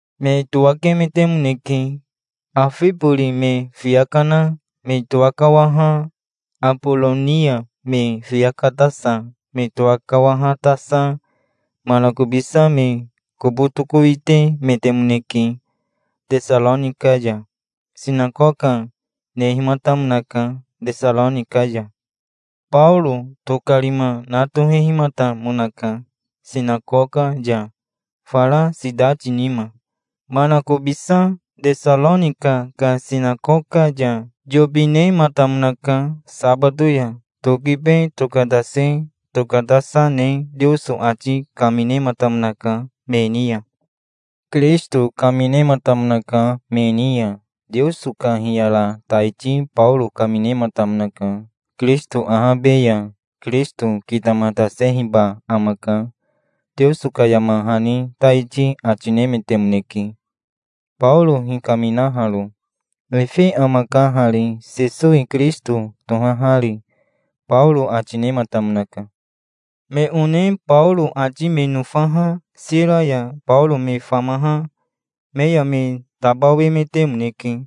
Me towakemetemonke. Afibori me fiya kana me towakawaha Aboronia me fiya katasa me towakawahatasa manakobisa me kobo tokowitemetemoneke Tesaronika ya. Sinakoka nehimatamonaka Tesaronika ya. Baoro tokarima na tohehimatamonaka sinakoka ya, fara sitati nima. Manakobisa Tesaronika ka sinakoka ya yobi nematamonaka sabato ya. Tokibe tokatase tokatasa ne Teoso ati kaminematamonaka me ni ya. Kirisito kaminematamonaka me ni ya. Teoso ka hiyara taiti Baoro kaminematamonaka. Kirisito ahabe ya Kirisito kitamatasehiba amaka, Teoso ka yama hani taiti ati nemetemoneke, Baoro hikaminaharo. "Efe amaka hari, Sesowi Kirisito tohahari", Baoro ati nematamonaka. Me one Baoro ati me nofaha Sira ya Baoro me famaha me ya me tabawemetemoneke.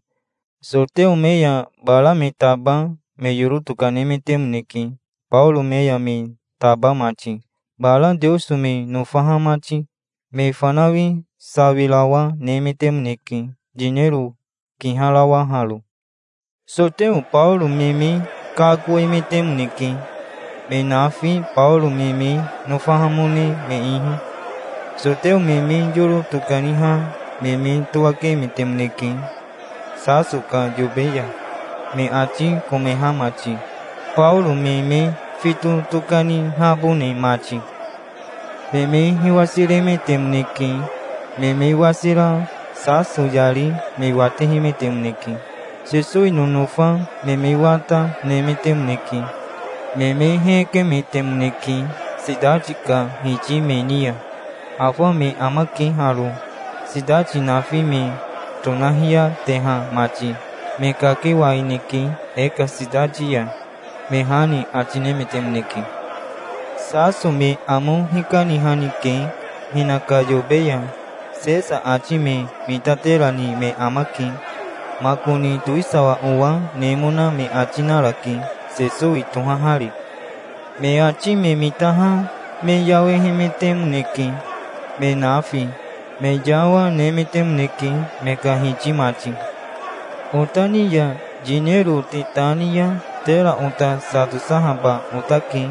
Soteo me ya bara me taba me yoro tokanemetemoneke, Baoro me ya me taba mati, bara Teoso me nofaha mati. Me fanawi sawirawa, nemetemoneke, yinero kiharawaharo. Soteo Baoro me me kakoemetemoneke, me nafi Baoro me me nofahamone me ihi. Soteo me me yoro tokaniha me me towakemetemoneke Saso ka yobe ya, me ati komeha mati, Baoro me me fito tokanihabone mati. Me me hiwasiremetemoneke. Me me wasira Saso yari me watehemetemoneke. Sesowi nonofa me me wata, nemetemoneke. Me me hekemetemoneke sitati ka hiti me ni ya. "Afa me amake haro, sitati nafi me tonahiyateha mati. Me kakewaineke e ka sitati ya", me ha ni ati nemetemoneke. "Saso me amo hikanihanike hinaka yobe ya. Sesa ati me mitaterani me amake. Makoni towisawa owa nemona me ati narake, Sesowi tohahari". Me ati me mitaha me yawehemetemoneke, me nafi. Me yawa, nemetemoneke, me ka hiti mati. "Ota ni ya yinero te ta ni ya tera ota sa tosahaba otake",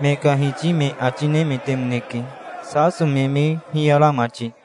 me ka hiti me ati nemetemoneke, Saso me me hiyara mati.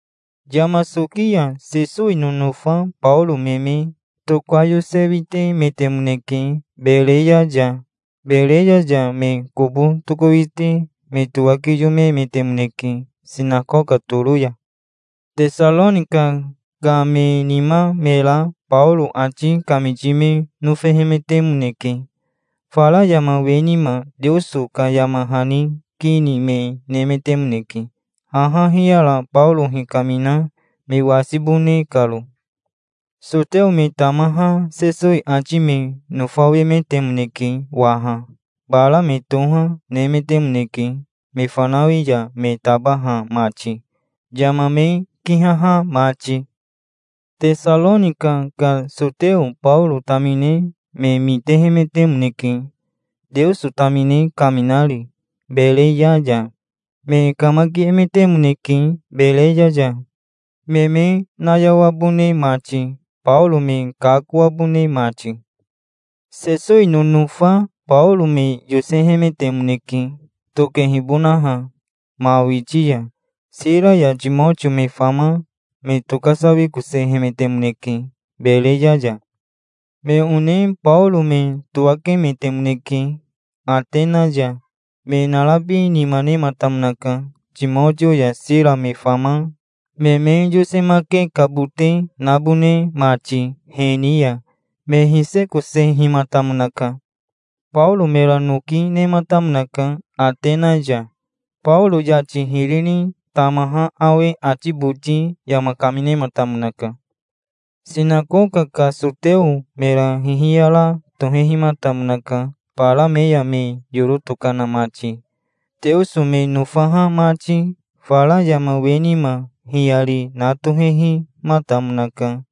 Yama soki ya Sesowi nonofa Baoro me me tokayosewitemetemoneke Bereya ya. Bereya ya me kobo tokowite me towakiyomemetemoneke sinakoka toro ya. Tesaronika ka me nima me ra Baoro ati kamiti me nofehemetemoneke. Fara yama we nima Teoso ka yama hani ki ni me nemetemoneke, haha hiyara Baoro hikamina me wasibone karo. Soteo me tamaha Sesowi ati me nofawemetemoneke waha. Bara me toha, nemetemoneke, me fanawi ya me tabaha mati, yama me kihaha mati. Tesaronika ka soteo Baoro tamine me mitehemetemoneke, Teoso tamine kaminari Bereya ya. Me kamakiemetemoneke Bereya ya, me me nayawabone mati, Baoro me kakoabone mati. Sesowi nonofa Baoro me yosehemetemoneke, tokehibonaha ma witi ya. Sira ya Timotio me fama me tokasawikosehemetemoneke Bereya ya. Me one Baoro me towakemetemoneke Atena ya. Me narabi nima nematamonaka, Timotio ya Sira me fama me me yosemakekabote nabone mati he ni ya. Me hisekosehimatamonaka. Baoro mera noki nematamonaka Atena ya. Baoro yati hiri ni tamaha awe ati boti yama kaminematamonaka. Sinakoka ka soteo mera hihiyara tohehimatamonaka, bara me ya me yoro tokana mati, Teoso me nofaha mati. Fara yama we nima hiyari na tohehimatamonaka,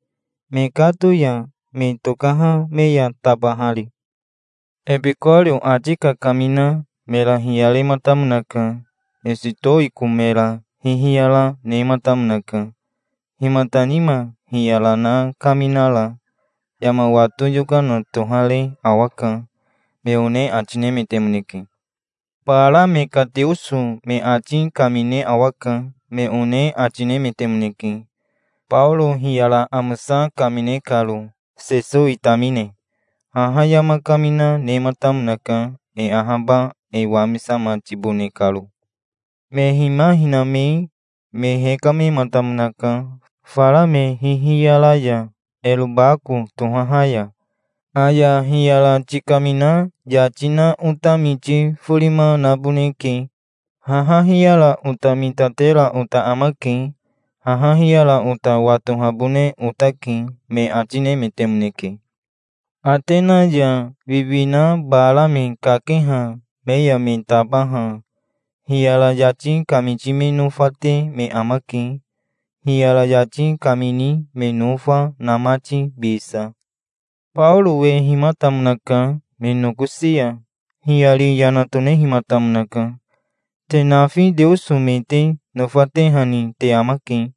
mekato ya me tokaha me ya tabahari. Ebikorio ati kakamina mera hiyarematamonaka. Esitowiko mera hihiyara nematamonaka. "Himata nima hiyara na kaminara? Yama wato yokana tohare awaka", me one ati nemetemoneke. "Bara me ka teoso me ati kamine awaka", me one ati, nemetemoneke, Baoro hiyara amosa kamine karo, Sesowi tamine. Haha yama kamina nematamonaka, e ahaba e wamisamatibone karo. Me hima hiname me hekamematamonaka, fara me hihiyara ya, Erobako tohaha ya. "Aya hiyara tikamina yati na ota miti forima naboneke. Haha hiyara ota mitatera ota amake. Haha hiyara ota watohabone otake", me ati nemetemoneke. Atena ya wiwina bara me kakeha me ya me tabaha hiyara yati kamiti me nofate me amake, hiyara yati kamini me nofa, na mati, bisa. Baoro wehimatamonaka me nokosi ya. Hiyari yana tonehimatamonaka. "Te nafi teoso me te nofatehani te amake.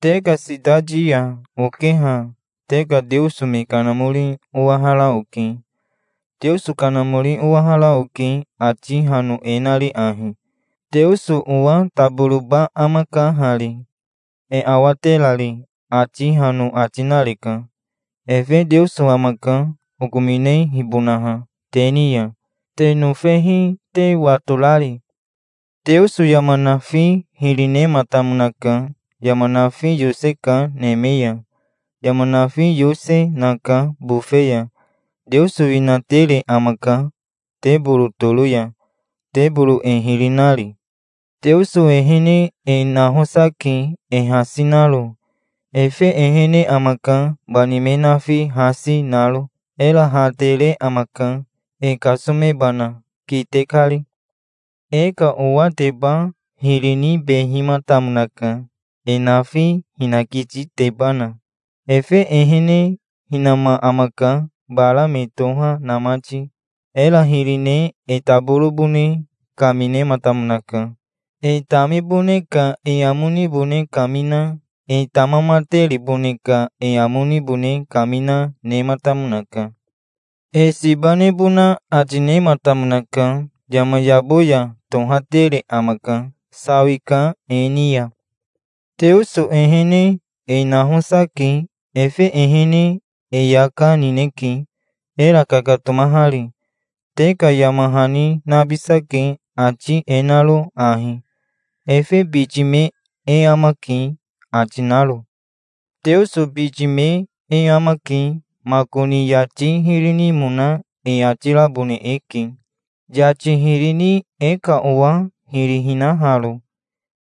Te ka sitati ya okeha te ka teoso me kanamori owahara oke. Teoso kanamori owahara oke, ati hano e nari ahi: 'Teoso owa taboroba amaka hari, e awaterari', ati hano ati nareka. Efe Teoso amaka, okominehibonaha te ni ya, te nofehi te watorari". "Teoso yama nafi hiri nematamonaka. Yama nafi yoseka neme ya. Yama nafi yose, naka bofe ya. Teoso winatere amaka teboro toro ya, teboro e hiri nari. Teoso ehene e nahosa ke, e hasi naro. Efe ehene amaka, bani me nafi hasi, naro. Era ha tere amaka, e kasomebana, kite kari. E ka owateba hiri nibehimatamonaka, e nafi hinakititebana. Efe ehene hinama amaka, bara me toha na mati. Era hiri ne e taborobone kaminematamonaka. E tamibone ka e amo nibone kamina, e tamamateribone ka e amo nibone kamina, nematamonaka. E siba nebona ati nematamonaka. Yama yabo ya tohatere amaka. Sawika e ni ya. Teoso ehene e nahosa ke. Efe ehene e yaka, nineke, era kakatomahari. Te ka yama hani nabisake, ati e naro ahi: 'Efe biti me e amake', ati naro. Teoso biti me e amake. Makoni yati hiri nimona e ati rabone eke, yati hiri ni e ka owa hiri hinaharo,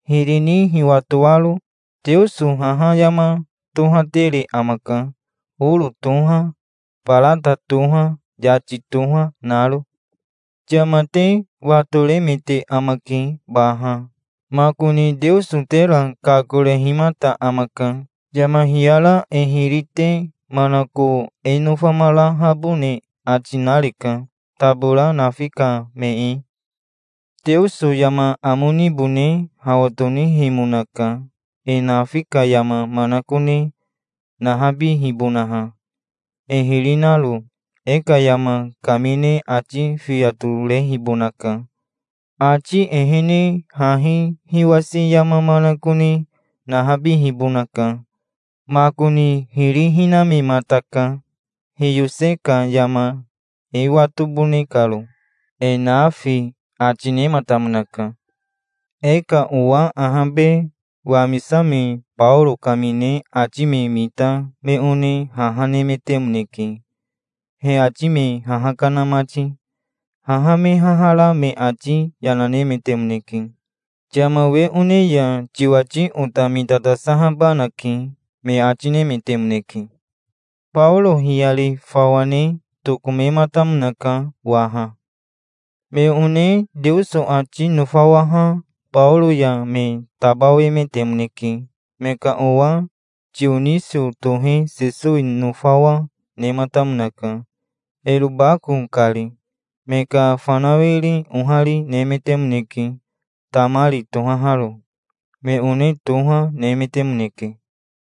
hiri ni hiwatoaro. Teoso haha yama tohatere amaka, oro toha, barata toha, yati toha, naro". "Yama te watoremete amake baha, makoni Teoso tera kakorehimata amaka. Yama hiyara e hiri te manako e nofamarahabone ati nareka, tabora nafi ka me e. Teoso yama amo nibone hawa tonihemonaka, e nafi ka yama manakone nahabihibonaha, e hiri naro. E ka yama kamine ati fiya torehibonaka. Ati ehene hahi hiwasi yama manakone nahabihibonaka. Makoni hiri hinamemataka, hiyose ka yama e watobone karo, e nafi", ati nematamonaka. E ka owa ahabe wamisame Baoro kamine ati me mita me one haha nemetemoneke, he ati me haha kana mati. Haha me haha ra me ati yana nemetemoneke. "Yama we one ya tiwati ota mitatasahabanake", me ati nemetemoneke. Baoro hiyari fawa ne tokomematamonaka waha. Me one Teoso ati nofawaha Baoro ya me tabawemetemoneke. Me ka owa Tionisio tohe Sesowi nofawa, nematamonaka, Erobako kari. Me ka fanawiri ohari, nemetemoneke, Tamari tohaharo. Me one toha, nemetemoneke.